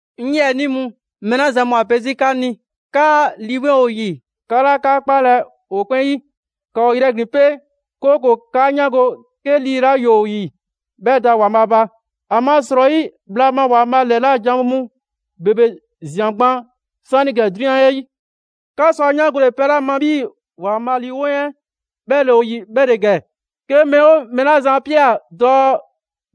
'Ŋ 'yiɛnii mu, mɛɛ 'la zan mu ‑a pe 'zi 'kaa Lii 'Weŋ ‑o ‑yi, 'ka 'laa 'ka 'kpalɛ‑ ‑o 'kpɛn 'yi. ‑Ka ‑o ‑yrɛglin 'pe, 'kooko‑ 'kaa 'yaango‑ 'ke lii 'la ‑yoo ‑o ‑yi 'bhɛ da ‑Waanbhaa' ba. ‑Amasrɔyi, bhla ma ‑Waanbhaa' ‑lɛla' janwo mu ‑bebe ꞊zian gban 'saanigɛ 'drunyan 'ɛ 'yi. 'Ka sɔ ‑a 'yaangole pɛ 'la ma 'bhii‑ ‑Waanbhaa' Lii 'Weŋ 'ɛ 'bhɛ ‑le ‑o ‑yi, 'bhɛ ‑le ‑gɛ: 'ke mɛɛ 'oo mɛɛ 'la zan 'a ꞊pia dɔɔ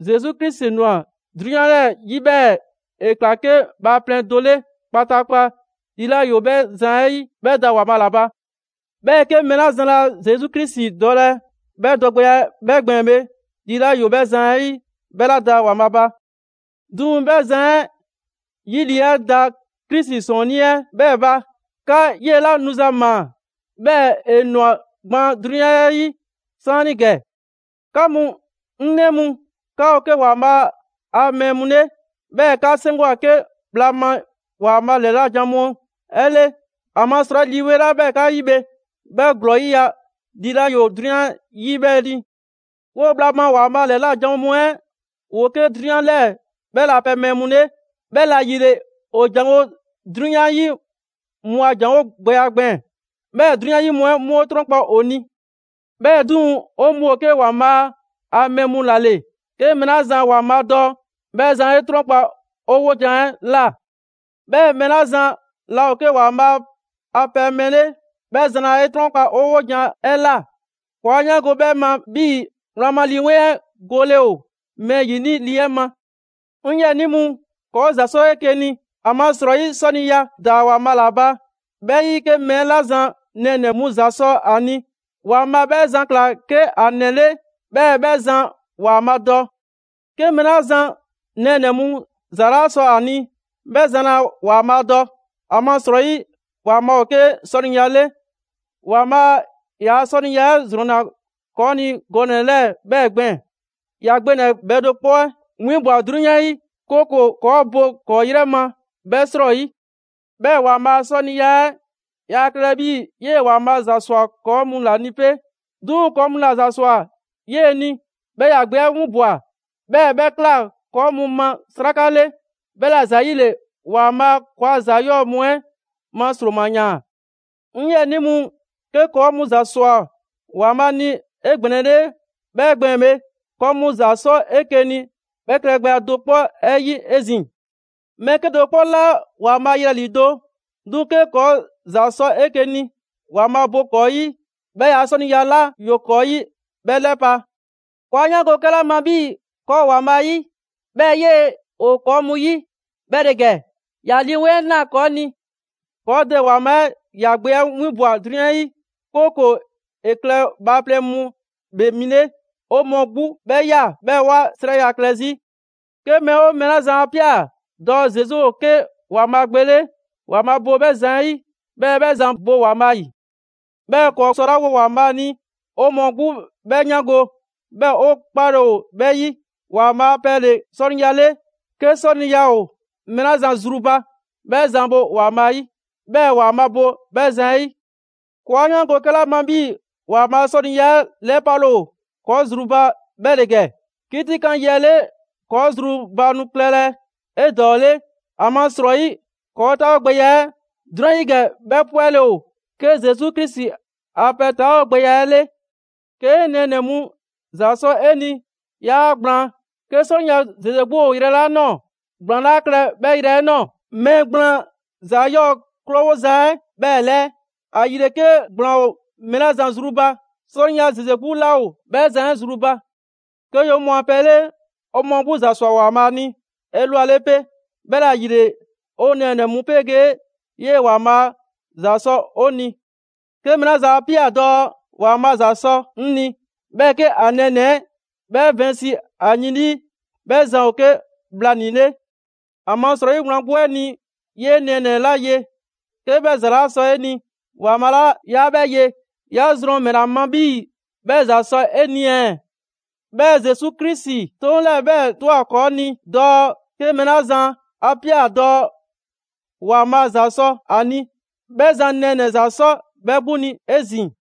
Zesu Krisi ‑nwa 'drunyan 'ɛ 'yi 'bhɛɛ‑ ‑e ꞊kla 'ke bhaaplɛŋ do 'le kpataakpa, lii 'la ‑yoo 'bhɛ zan 'ɛ 'yi bhɛ da ‑Waanbhaa' ‑la ba. 'Bhɛɛ‑ 'ke mɛɛ 'la zan laa Zesu Krisi dɔlɛ 'bhɛ dɔgbɛya 'ɛ gbɛɛn‑ bhe, lii 'la ‑yoo 'bhɛ zan 'ɛ ‑yi, 'bhɛ 'laa da ‑Waanbhaa' ba. 'Duŋ‑ 'bhɛ zan 'ɛ 'yi lii 'ɛ da Krisi 'Sɔɔnnii 'ɛ 'bhɛɛ‑ ba. 'Ka 'yela‑ nuza ꞊maa, 'bhɛɛ‑ ‑e ‑nwa gban 'drunyan 'ɛ 'yi 'saanigɛ. 'Ka mu 'ŋ 'nɛ mu, 'ka ‑o 'ke ‑Waanbhaa' a mɛɛ mu 'le, 'bhɛɛ‑ 'ka 'seŋgwa‑ 'ke bhla ma ‑Waanbhaa' ‑lɛla' janwo mu 'ɛ 'le. ‑Amasrɔyi, Lii 'Weŋ 'la ‑yoo 'ka 'yi bhe 'bhɛ ‑glɔɔ 'yiya‑ lii 'la ‑yoo 'drunyan 'yi 'bhɛ ni. 'Woo‑ bhla ma ‑Waanbhaa' ‑lɛla' janwo mu 'ɛ, ‑woo 'ke 'drunyan 'lɛɛ‑ 'bhɛ ‑laa pɛ mɛɛ mu 'le, 'bhɛla‑ ‑yile ‑o ‑janwo' 'drunyan 'yi mu a ‑janwo' gbɛya gbɛɛn‑, 'bhɛɛ‑ 'drunyan 'yi mu 'ɛ 'mu 'e 'trɔnkpa ‑o ni. 'Bhɛɛ‑ 'duŋ‑, 'o mu ‑o 'ke ‑Waanbhaa' a mɛɛ mu ‑la ‑le. 'Ke mɛɛ 'la zan ‑Waanbhaa' dɔ, 'bhɛ zan 'e 'trɔnkpa‑ 'o 'wojan‑ 'ɛ ꞊la. 'Bhɛɛ‑ mɛɛ 'la zan laa ‑o 'ke ‑Waanbhaa' a pɛ mɛɛ 'le, 'bhɛ zan laa 'e 'trɔnkpa‑ 'o 'wojan‑ 'ɛ ꞊la. ‑Kɔɔ' 'a 'yaango‑ 'bhɛɛ‑ ma 'bhii‑ wlan ma Lii 'Weŋ 'ɛ gole ‑o mɛɛ ‑yini' lii 'ɛ ma. 'Ŋ 'yiɛnii mu, ‑kɔɔ' ‑za 'sɔ 'eke‑ ni; ‑amasrɔyi, 'sɔniya da ‑Waanbhaa' ‑la ba. 'Bhɛ 'yi, 'ke mɛɛ 'la zan nɛɛnɛ‑ mu ‑za sɔ a ni, ‑Waanbhaa' 'bhɛ zan ‑kla 'ke ‑a ‑nɛ 'le 'bhɛɛ‑ 'bhɛ zan ‑Waanbhaa' dɔ. 'Ke mɛɛ 'la zan nɛɛnɛ‑ mu ‑za 'laa sɔ ‑a ni, 'bhɛ zan laa ‑Waanbhaa' dɔ; ‑amasrɔyi, ‑Waanbhaa' ‑o 'ke 'sɔniya 'le. ‑Waanbhaa' ‑yaa' 'sɔniya 'ɛ ‑zrɔnna ‑kɔɔ' ni gɔnɛ‑ 'lɛɛ‑ 'bhɛɛ‑ gbɛɛn‑: ‑Ya Gbe ‑nɛ bhɛ do 'kpɔ 'ɛ 'winbwa‑ 'drunyan 'yi, 'kooko‑ ‑kɔɔ' bo 'kɔɔ‑ ‑yrɛ ma 'bhɛ 'srɔyi. 'Bhɛɛ‑ ‑Waanbhaa' a 'sɔniya 'ɛ yaa klɛlɛ 'bhii‑ 'yee‑ ‑Waanbhaa' ‑za ‑swa ‑kɔɔ' mu ‑la ni 'pe. 'Duŋ‑ ‑kɔɔ' mu ‑la ‑za ‑swa 'yee‑ ni, 'bhɛɛ‑ ‑ya Gbe 'ɛ 'winbwa‑, 'bhɛɛ‑ 'bhɛ ꞊kla ‑kɔɔ' mu ma 'sraka 'le. 'Bhɛla‑ ‑zayile ‑Waanbhaa' ‑kɔɔa' ‑za 'yɔɔ‑ mu 'ɛ ma ‑sroma ‑yaan. 'Ŋ 'yiɛnii mu, 'ke ‑kɔɔ' mu ‑za ‑swa ‑Waanbhaa' ni 'egbɛnɛle 'bhɛ gbɛɛn‑ bhe, ‑kɔɔ' mu ‑za 'sɔ 'eke‑ ni 'bhɛ klɛgbɛya 'ɛ do 'kpɔ 'ɛ 'yi 'ezin‑. Mɛɛ 'kedo‑ 'kpɔ 'laa ‑Waanbhaa' yelɛ ‑lido'; 'duŋ‑ 'ke ‑kɔɔ' ‑za sɔ 'eke‑ ni, ‑Waanbhaa' bo ‑kɔɔ' 'yi, 'bhɛɛ‑ ‑yaa' 'sɔniya 'la ‑yoo ‑kɔɔ' 'yi, 'bhɛ 'lɛpa‑. ‑Kɔɔ' 'a 'yaango‑ 'kɛla ma 'bhii‑ ‑kɔɔ' ‑o ‑Waanbhaa' 'yi, 'bhɛɛ‑ 'yee‑ ‑o ‑kɔɔ' mu 'yi, 'bhɛ ‑le ‑gɛ: ‑Ya Lii 'Weŋ 'ɛ ꞊naa ‑kɔɔ' ni. ‑Kɔɔ' Dɛ ‑Waanbhaa' 'ɛ ‑ya Gbe 'ɛ 'winbwa‑ 'drunyan 'yi, 'kooko‑ ‑e klɛ bhaaplɛŋ mu ‑Bhee Mi 'le. 'O mɔɔ 'gbu 'bhɛ ꞊ya 'bhɛɛ‑ 'wa 'srɛya‑ klɛ 'zi. 'Ke mɛɛ 'oo mɛɛ 'la zan 'a ꞊pia dɔɔ Zesu ‑o 'ke ‑Waanbhaa' Gbe 'le, ‑Waanbhaa' bo 'bhɛ zan 'ɛ 'yi, 'bhɛɛ‑ 'bhɛ zan bo ‑Waanbhaa' ‑yi. 'Bhɛɛ‑ ‑kɔɔ' 'sɔlawo ‑Waanbhaa' ni 'o mɔɔ 'gbu 'bhɛ 'yaango‑, 'bhɛɛ‑ 'o 'kpale‑ ‑o 'bhɛ 'yi. ‑Waanbhaa' a pɛ ‑le 'sɔniya 'le; 'ke 'sɔniya ‑o mɛɛ 'la zan zru ba, 'bhɛ zan bo ‑Waanbhaa' 'yi, 'bhɛɛ‑ ‑Waanbhaa' bo 'bhɛ zan 'ɛ 'yi. ‑Kɔɔ' 'a 'yaango‑ 'kɛla ma 'bhii‑ ‑Waanbhaa' a 'sɔniya 'ɛ 'lɛpale ‑o ‑kɔɔ' zru ba 'bhɛ ‑le ‑gɛ: 'kitikan yi 'ɛ 'le, ‑kɔɔ' zru ba nu klɛlɛ 'edɔɔle, ‑amasrɔyi ‑kɔɔ' 'taawogbɛya 'ɛ 'drunyan 'yi ‑gɛ 'bhɛ 'pwɛle‑ ‑o 'ke Zesu Krisi a pɛ 'taawogbɛya 'ɛ 'le. 'Kee‑ nɛɛnɛ‑ mu ‑za sɔ 'e ni 'yaa ‑gblaan. 'Ke 'sɔniya ‑zeze 'gbu ‑o yrɛ 'la ꞊nɔɔ ‑gblaan 'laa klɛ 'bhɛ yrɛ 'ɛ ꞊nɔɔ. Mɛɛ gblaan ‑za 'yɔɔ‑ 'krowoza 'ɛ 'bhɛɛ‑ ‑lɛɛ. ‑Ayile 'ke ‑gblaan ‑o mɛɛ 'la zan zru ba, 'sɔniya ‑zeze 'gbu 'laa ‑o 'bhɛ zan 'ɛ zru ba. 'Ke ‑yoo 'o mɔɔ a pɛ 'le, 'o mɔɔ 'gbu ‑za ‑swa ‑Waanbhaa' ni 'elwale 'pe, 'bhɛla‑ ‑yile 'o nɛɛnɛ‑ mu 'pegee 'yee‑ ‑Waanbhaa' ‑za sɔ 'o ni. 'Ke mɛɛ 'la zan 'a ꞊pia dɔɔ: «‑Waanbhaa' ‑za sɔ 'ŋ ni». 'Bhɛɛ‑ 'ke ‑a nɛɛnɛ‑ 'ɛ 'bhɛ vɛnsi ‑a yin 'lii, 'bhɛ zan ‑o 'ke bhlanii‑ 'le. ‑Amasrɔyi wlan 'gbu 'ɛ ni, 'yee nɛɛnɛ‑ 'la ye, 'ke 'bhɛ ‑za 'laa sɔ 'e ni; ‑Waanbhaa' 'la 'yaa 'bhɛ ye, 'ya zrɔn ‑mɛla ma 'bhii‑ 'bhɛ ‑za sɔ 'e ni ɛɛ? 'Bhɛɛ‑ Zesu Krisi 'toŋ 'lɛɛ‑ 'bhɛɛ‑ ꞊twa ‑kɔɔ' ni dɔɔ: 'ke mɛɛ 'la zan 'a ꞊pia dɔɔ ‑Waanbhaa' ‑za sɔ ‑a ni, 'bhɛ zan nɛɛnɛ‑ ‑za 'sɔ 'bhɛ 'gbu ni 'ezin‑.